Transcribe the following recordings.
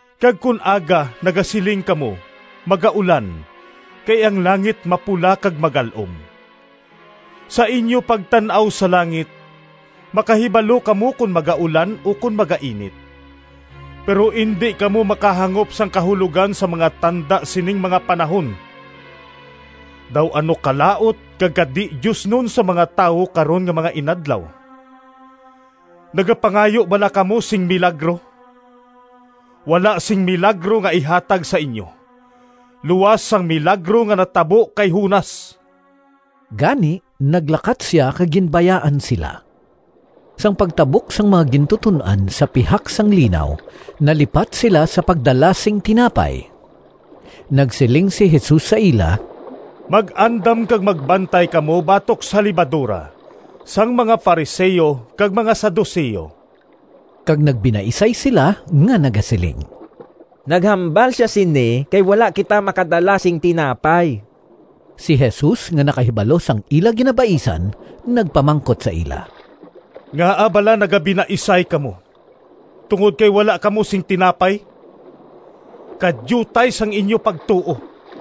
Kag kon aga nagasiling kamo, ‘Magaulan, kay ang langit mapula kag magal-om.’ Sa inyo pagtan-aw sa langit makahibalo kamo kon magaulan ukon magainit, pero indi kamo makahangop sang kahulogan sang mga tanda sining mga panahon! Daw ano kalaut kag kadi-diosnon sang mga tawo karon nga mga inadlaw. Nagapangayo bala kamo sing milagro? Wala sing milagro nga ihatag sa inyo luas sang milagro nga natabo kay Jonas.” Gani naglakat sia kag ginbayaan sila. Sang pagtabok sang mga gintuton-an sa pihak sang linaw, nalipat sila sa pagdala sing tinapay. Nagsiling si Jesus sa ila, “Mag-andam kag magbantay kamo batok sa lebadora sang mga Fariseo kag mga Saduceo.” Kag nagbinaisay sila nga nagasiling, “Naghambal sia sini kay wala kita makadala sing tinapay.” Si Jesus nga nakahibalo sang ila ginabaisan, nagpamangkot sa ila, “Ngaa bala nagabinaisay kamo tungod kay wala kamo sing tinapay? Kadiutay sang inyo pagtuo!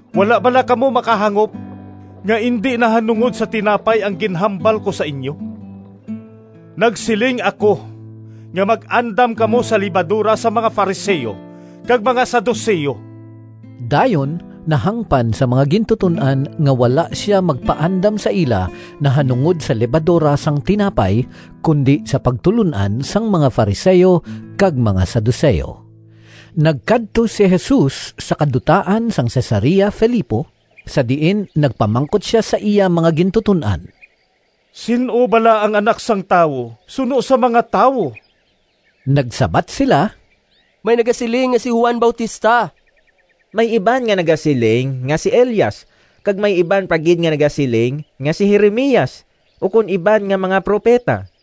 Wala bala kamo makahangop nga indi nahanungod sa tinapay ang ginhambal ko sa inyo? Nagsiling ako nga mag-andam kamo sa lebadora sang mga Fariseo kag mga Saduceo!” Dayon nahangpan sang mga gintuton-an nga wala sia magpaandam sa ila nahanungod sa lebadora sang tinapay, kundi sa pagtulon-an sang mga Fariseo kag mga Saduceo. Nagkadto si Jesus sa kadutaan sang Cesarea Filipo sa diin nagpamangkot sia sa iya mga gintuton-an, “Sin-o bala ang Anak sang Tawo suno sa mga tawo?” Nagsabat sila, “May nagasiling nga si Juan Bautista. May iban nga nagasiling nga si Elias kag may iban pa gid nga nagasiling nga si Jeremias ukon iban nga mga propeta.”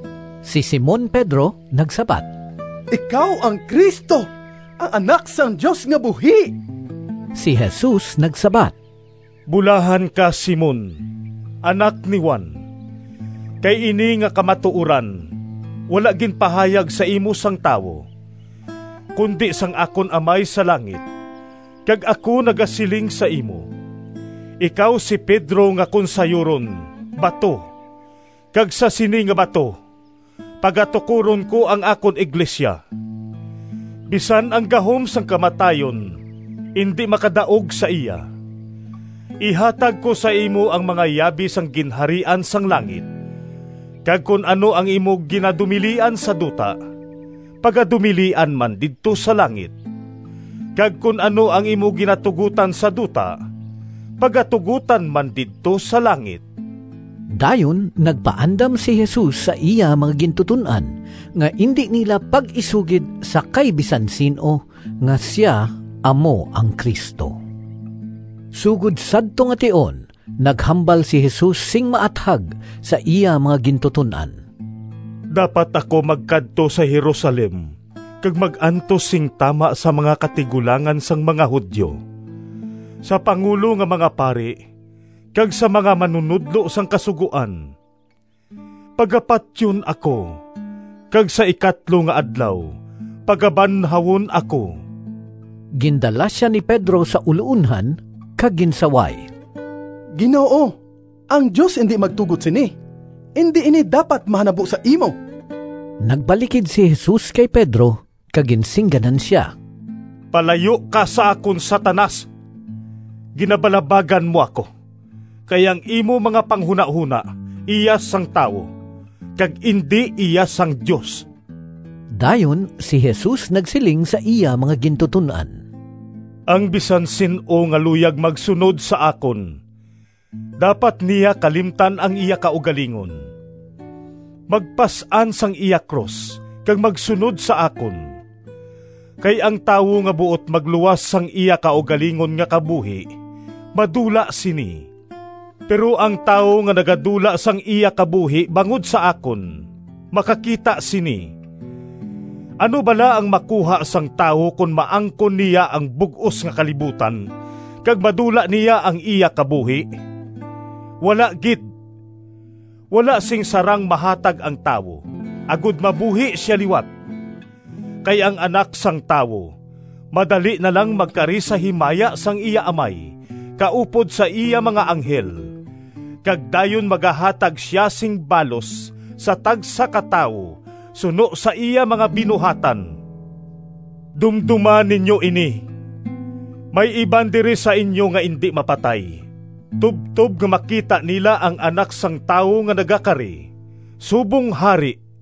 Si Simon Pedro nagsabat, “Ikaw ang Cristo, ang Anak sang Dios nga buhi.” Si Jesus nagsabat, “Bulahan ka, Simon, anak ni Juan! Kay ini nga kamatuoran wala ginpahayag sa imo sang tawo, kundi sang akon Amay sa langit. Kag ako nagasiling sa imo, ikaw si Pedro nga kon sayuron ‘Bato’ kag sa sini nga bato pagatukoron ko ang akon iglesia. Bisan ang gahom sang kamatayon indi makadaog sa iya. Ihatag ko sa imo ang mga yabi sang Ginharian sang langit, kag kon ano ang imo ginadumilian sa duta pagadumilian man didto sa langit, kag kon ano ang imo ginatugotan sa duta pagatugotan man didto sa langit.” Dayon nagpaandam si Jesus sa iya mga gintuton-an, nga indi nila pag-isugid sa kay bisan sin-o nga sia amo ang Cristo. Sugod sadto nga tion naghambal si Jesus sing maathag sa iya mga gintuton-an, “Dapat ako magkadto sa Jerusalem kag mag-antos sing tama sa mga katigulangan sang mga Judio, sa pangulo nga mga pari, kag sa mga manunodlo sang Kasugoan. Pagapatyon ako, kag sa ikatlo nga adlaw pagabanhawon ako.” Gindala sia ni Pedro sa uloonhan kag ginsaway, “Ginoo, ang Dios indi magtugot sini! Indi ini dapat mahanabo sa imo!” Nagbalikid si Jesus kay Pedro kag ginsingganan sia, “Palayo ka sa akon, Satanas! Ginabalabagan mo ako, kay ang imo mga panghunahona iya sang tawo, kag indi iya sang Dios!” Dayon si Jesus nagsiling sa iya mga gintuton-an, “Ang bisan sin-o nga luyag magsunod sa akon, dapat niya kalimtan ang iya kaugalingon, magpas-an sang iya krus kag magsunod sa akon. Kay ang tawo nga buot magluwas sang iya kaugalingon nga kabuhi madula sini, pero ang tawo nga nagadula sang iya kabuhi bangod sa akon makakita sini. Ano bala ang makuha sang tawo kon maangkon niya ang bug-os nga kalibutan kag madula niya ang iya kabuhi? Wala gid! Wala sing sarang mahatag ang tawo agod mabuhi sia liwat. Kay ang Anak sang Tawo madali na lang magkari sa himaya sang iya Amay kaupod sa iya mga anghel, kag dayon magahatag sia sing balos sa tagsa ka tawo suno sa iya mga binuhatan. Dumdoma ninyo ini! May iban diri sa inyo nga indi mapatay tubtob nga makita nila ang Anak sang Tawo nga nagakari subong Hari.”